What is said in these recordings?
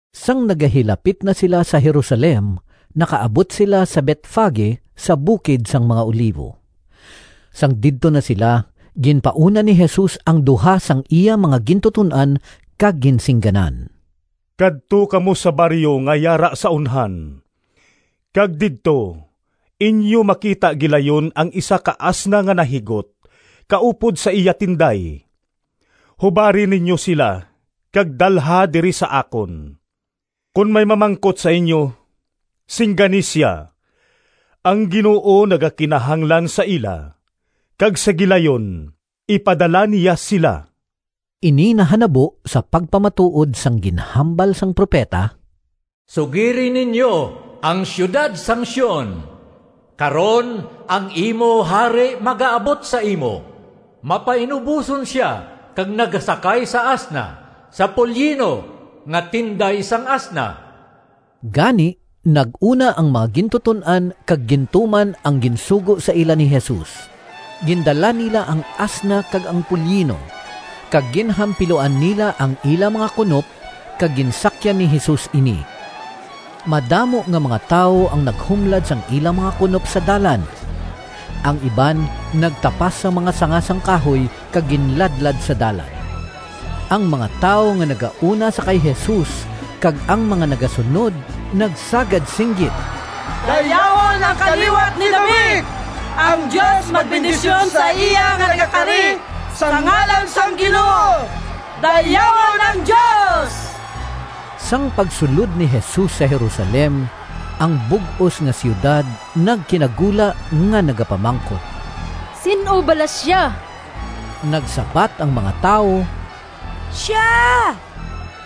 Sang nagahilapit na sila sa Jerusalem, nakaabot sila sa Betfage, sa bukid sang mga Olivo. Sang didto na sila, ginpauna ni Jesus ang duha sang iya mga gintuton-an kag ginsingganan, “Kadto kamo sa baryo nga yara sa unhan, kag didto inyo makita gilayon ang isa ka asna nga nahigot kaupod sa iya tinday. Hubari ninyo sila kag dalha diri sa akon. Kon may mamangkot sa inyo, singgani sia, ‘Ang Ginoo nagakinahanglan sa ila,’ kag sa gilayon ipadala niya sila.” Ini nahanabo sa pagpamatuod sang ginhambal sang propeta: “Sugiri ninyo ang siyudad sang Sion, Karon ang imo hari magaabot sa imo, Mapainuboson sia Kag nagasakay sa asna, Sa polyino, nga tinday sang asna.” Gani nag-una ang mga gintuton-an kag gintuman ang ginsugo sa ila ni Jesus. Gindala nila ang asna kag ang polyino, kag ginhampiluan nila ang ila mga kunop kag ginsakyan ni Jesus ini. Madamo nga mga tawo ang naghumlad sang ila mga kunop sa dalan. Ang iban nagtapas sang mga sanga sang kahoy kag ginladlad sa dalan. Ang mga tawo nga nagauna sa kay Jesus kag ang mga nagasunod nagsagad singgit, “Dayawon ang kaliwat ni David! Ang Dios magbendisyon sa iya nga nagakari sa ngalan sang Ginoo! Dayawon ang Dios!” Sang pagsulod ni Jesus sa Jerusalem, ang bug-os nga siyudad nagkinagula nga nagapamangkot, “Sin-o bala sia?” Nagsabat ang mga tawo, “Sia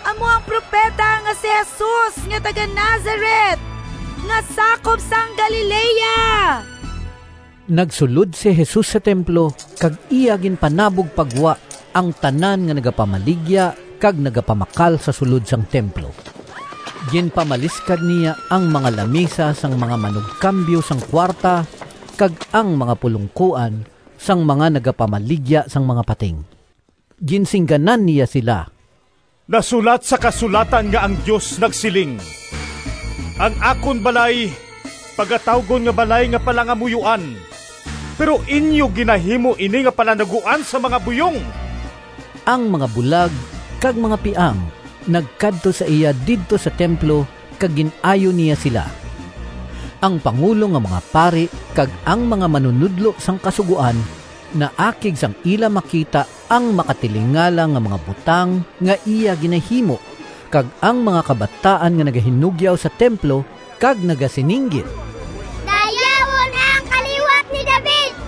amo ang propeta nga si Jesus nga taga-Nazaret nga sakop sang Galilea.” Nagsulod si Jesus sa templo kag iya ginpanabog pa gwa ang tanan nga nagapamaligya kag nagapamakal sa sulod sang templo. Ginpamaliskad niya ang mga lamisa sang mga manugkambyo sang kuwarta, kag ang mga pulongkoan sang mga nagapamaligya sang mga pating. Ginsingganan niya sila, “Nasulat sa Kasulatan nga ang Dios nagsiling, ‘Ang akon balay pagatawgon nga balay nga palangamuyoan.’ Pero inyo ginahimo ini nga palanaguan sang mga buyong!” Ang mga bulag kag mga piang nagkadto sa iya didto sa templo kag gin-ayo niya sila. Ang pangulo nga mga pari kag ang mga manunodlo sang Kasugoan naakig sang ila makita ang makatilingala nga mga butang nga iya ginahimo kag ang mga kabataan nga nagahinugyaw sa templo kag nagasininggit, “Dayawon ang kaliwat ni David!”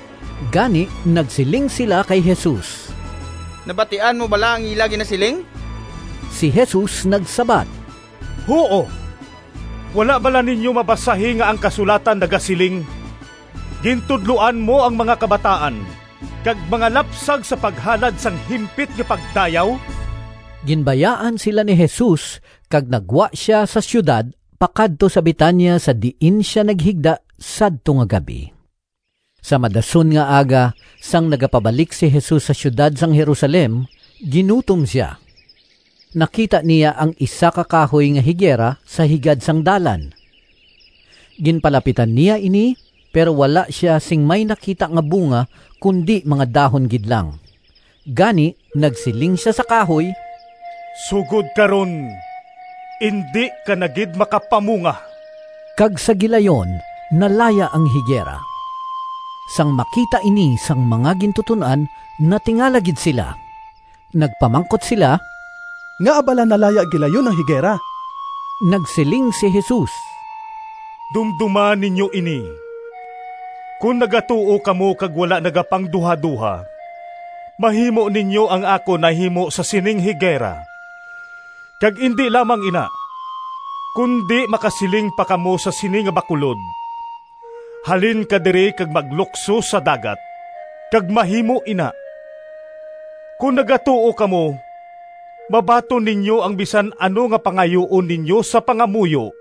Gani nagsiling sila kay Jesus, “Nabatian mo bala ang ila ginasiling?” Si Jesus nagsabat, “Huo! Wala bala ninyo mabasahi nga ang kasulatan nagasiling, ‘Gintudloan mo ang mga kabataan kag mga lapsag sa paghalad sang himpit nga pagdayaw’?” Ginbayaan sila ni Jesus kag naggwa sia sa siyudad pakadto sa Betania sa diin sia naghigda sadto nga gab-i. Sa madason nga aga, sang nagapabalik si Jesus sa siyudad sang Jerusalem, ginutom sia. Nakita niya ang isa ka kahoy nga higera sa higad sang dalan. Ginpalapitan niya ini, pero wala sia sing may nakita nga bunga kundi mga dahon gid lang. Gani nagsiling sia sa kahoy, “Sugod karon indi ka na gid makapamunga!” Kag sa gilayon nalaya ang higera. Sang makita ini sang mga gintuton-an natingala gid sila. Nagpamangkot sila, “Ngaa bala nalaya gilayon ang higera?” Nagsiling si Jesus, “Dumdoma ninyo ini! Kon nagatuo kamo kag wala nagapangduhadoha, mahimo ninyo ang akon nahimo sa sining higera; kag indi lamang ina, kundi makasiling pa kamo sa sini nga bakulod, ‘Halin ka diri kag maglukso sa dagat,’ kag mahimo ina. Kon nagatuo kamo, mabaton ninyo ang bisan ano nga pangayuon ninyo sa pangamuyo.”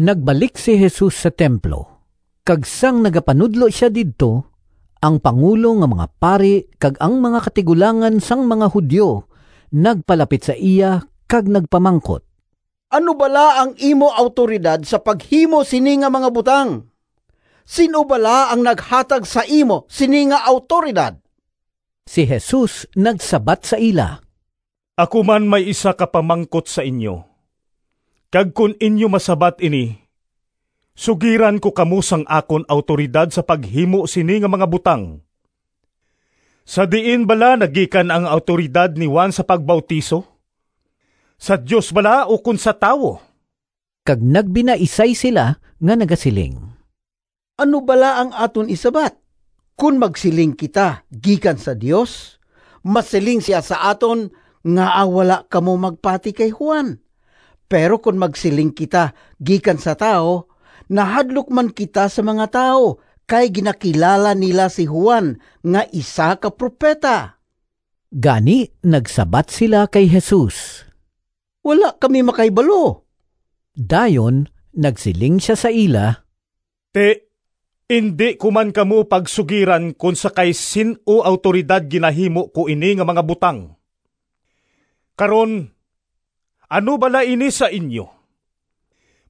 Nagbalik si Jesus sa templo, kag sang nagapanudlo sia didto, ang pangulo nga mga pari kag ang mga katigulangan sang mga Judio nagpalapit sa iya kag nagpamangkot, “Ano bala ang imo awtoridad sa paghimo sini nga mga butang? Sin-o bala ang naghatag sa imo sini nga awtoridad?” Si Jesus nagsabat sa ila, “Ako man may isa ka pamangkot sa inyo, kag kon inyo masabat ini sugiran ko kamo sang akon awtoridad sa paghimo sini nga mga butang. Sa diin bala nagikan ang awtoridad ni Juan sa pagbautiso, sa Dios bala ukon sa tawo?” Kag nagbinaisay sila nga nagasiling, “Ano bala ang aton isabat? Kon magsiling kita, ‘Gikan sa Dios,’ masiling sia sa aton, ‘Ngaa wala kamo magpati kay Juan?’ Pero kon magsiling kita, ‘Gikan sa tawo,’ nahadlok man kita sa mga tawo kay ginakilala nila si Juan nga isa ka propeta.” Gani nagsabat sila kay Jesus, “Wala kami makahibalo.” Dayon nagsiling sia sa ila, “Ti, indi ko man kamo pagsugiran kon sa kay sin-o awtoridad ginahimo ko ini nga mga butang.” “Karon, ano bala ini sa inyo?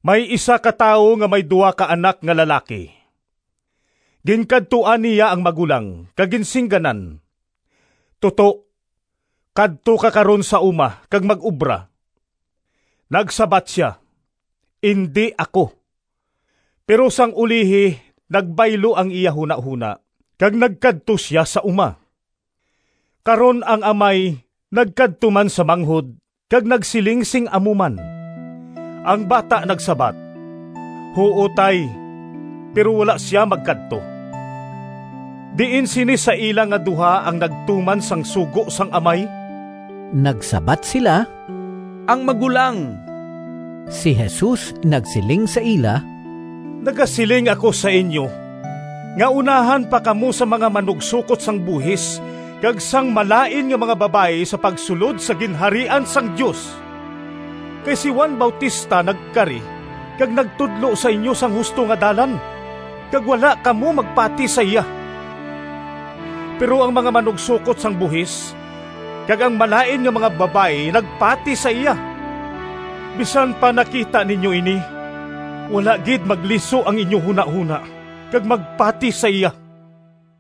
May isa ka tawo nga may duha ka anak nga lalaki. Ginkadtuan niya ang magulang kag ginsingganan, ‘Toto, kadto ka karon sa uma kag mag-obra.’ Nagsabat sia, ‘Indi ako!’ Pero sang ulihi nagbaylo ang iya hunahona kag nagkadto sia sa uma. Karon ang amay nagkadto man sa manghod kag nagsiling sing amo man. Ang bata nagsabat, ‘Huo, Tay,’ pero wala sia magkadto. Diin sini sa ila nga duha ang nagtuman sang sugo sang amay?” Nagsabat sila, “Ang magulang.” Si Jesus nagsiling sa ila, “Nagasiling ako sa inyo nga unahan pa kamo sang mga manugsokot sang buhis kag sang malain nga mga babayi sa pagsulod sa Ginharian sang Dios. Kay si Juan Bautista nagkari kag nagtudlo sa inyo sang husto nga dalan, kag wala kamo magpati sa iya, pero ang mga manugsokot sang buhis kag ang malain nga mga babayi nagpati sa iya. Bisan pa nakita ninyo ini, wala gid magliso ang inyo hunahona kag magpati sa iya.”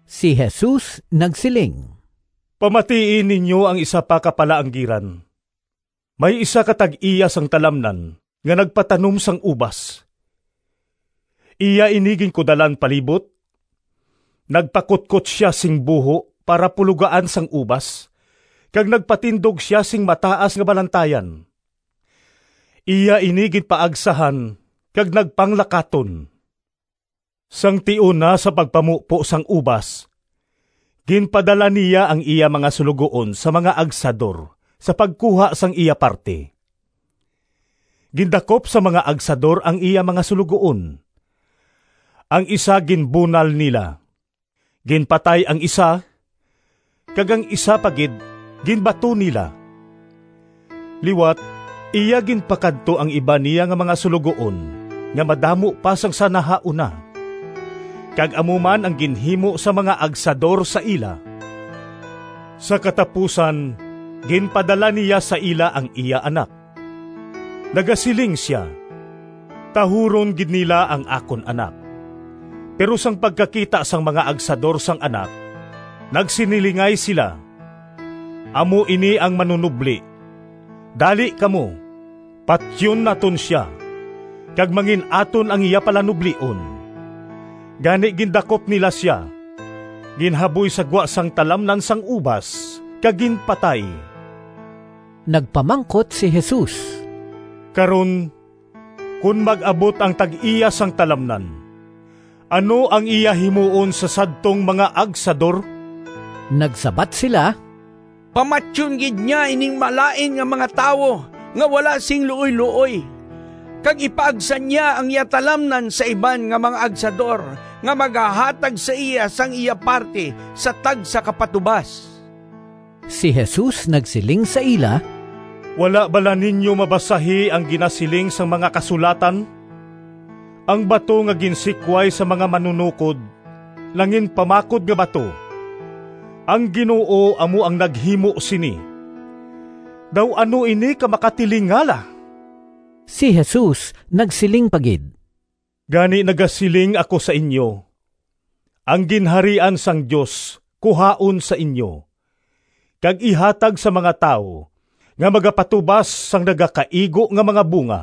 Si Jesus nagsiling, “Pamatii ninyo ang isa pa ka palaanggiran: may isa ka tag-iya sang talamnan nga nagpatanom sang ubas. Iya ini ginkudalan palibot, nagpakutkot sia sing buho para pulogaan sang ubas kag nagpatindog sia sing mataas nga balantayan. Iya ini ginpaagsahan kag nagpanglakaton. Sang tion na sa pagpamupo sang ubas, ginpadala niya ang iya mga suloguon sa mga agsador sa pagkuha sang iya parti. Gindakop sang mga agsador ang iya mga suloguon: ang isa ginbunal nila, ginpatay ang isa, kag ang isa pa gid ginbato nila. Liwat iya ginpakadto ang iban niya nga mga suloguon nga madamo pa sang sa nahauna, kag amo man ang ginhimo sang mga agsador sa ila. Sa katapusan ginpadala niya sa ila ang iya anak. Nagasiling sia, ‘Tahuron gid nila ang akon anak.’ Pero sang pagkakita sang mga agsador sang anak, nagsinilingay sila, ‘Amo ini ang manunobli. Dali kamo, patyon naton sia, kag mangin-aton ang iya palanublion!’ Gani gindakop nila sia, ginhaboy sa gwa sang talamnan sang ubas, kag ginpatay.” Nagpamangkot si Jesus, “Karon, kon mag-abot ang tag-iya sang talamnan, ano ang iya himuon sa sadtong mga agsador?” Nagsabat sila, “Pamatyon gid niya ining malain nga mga tawo nga wala sing luoyluoy, kag ipaagsa niya ang iya talamnan sa iban nga mga agsador nga magahatag sa iya sang iya parti sa tagsa ka patubas.” Si Jesus nagsiling sa ila, “Wala bala ninyo mabasahi ang ginasiling sang mga Kasulatan? ‘Ang bato Nga ginsikway sang mga manunokod Nanginpamakod nga bato. Ang Ginoo amo ang naghimo sini, Daw ano ini ka makatilingala!’” Si Jesus nagsiling pa gid, “Gani nagasiling ako sa inyo, ang Ginharian sang Dios kuhaon sa inyo, kag ihatag sa mga tawo nga magapatubas sang nagakaigo nga mga bunga. [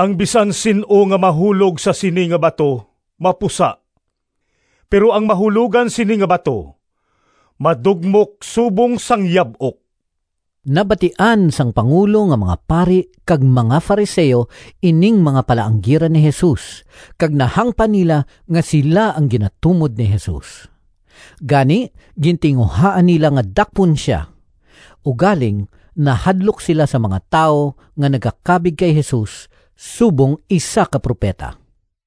Ang bisan sin-o nga mahulog sa sini nga bato mapusa, pero ang mahulogan sini nga bato madugmok subong sang yab-ok.]” Nabatian sang pangulo nga mga pari kag mga Fariseo ining mga palaanggiran ni Jesus kag nahangpan nila nga sila ang ginatumod ni Jesus. Gani gintinguhaan nila nga dakpon sia. Ugaling nahadlok sila sa mga tawo, nga nagakabig kay Jesus subong isa ka propeta.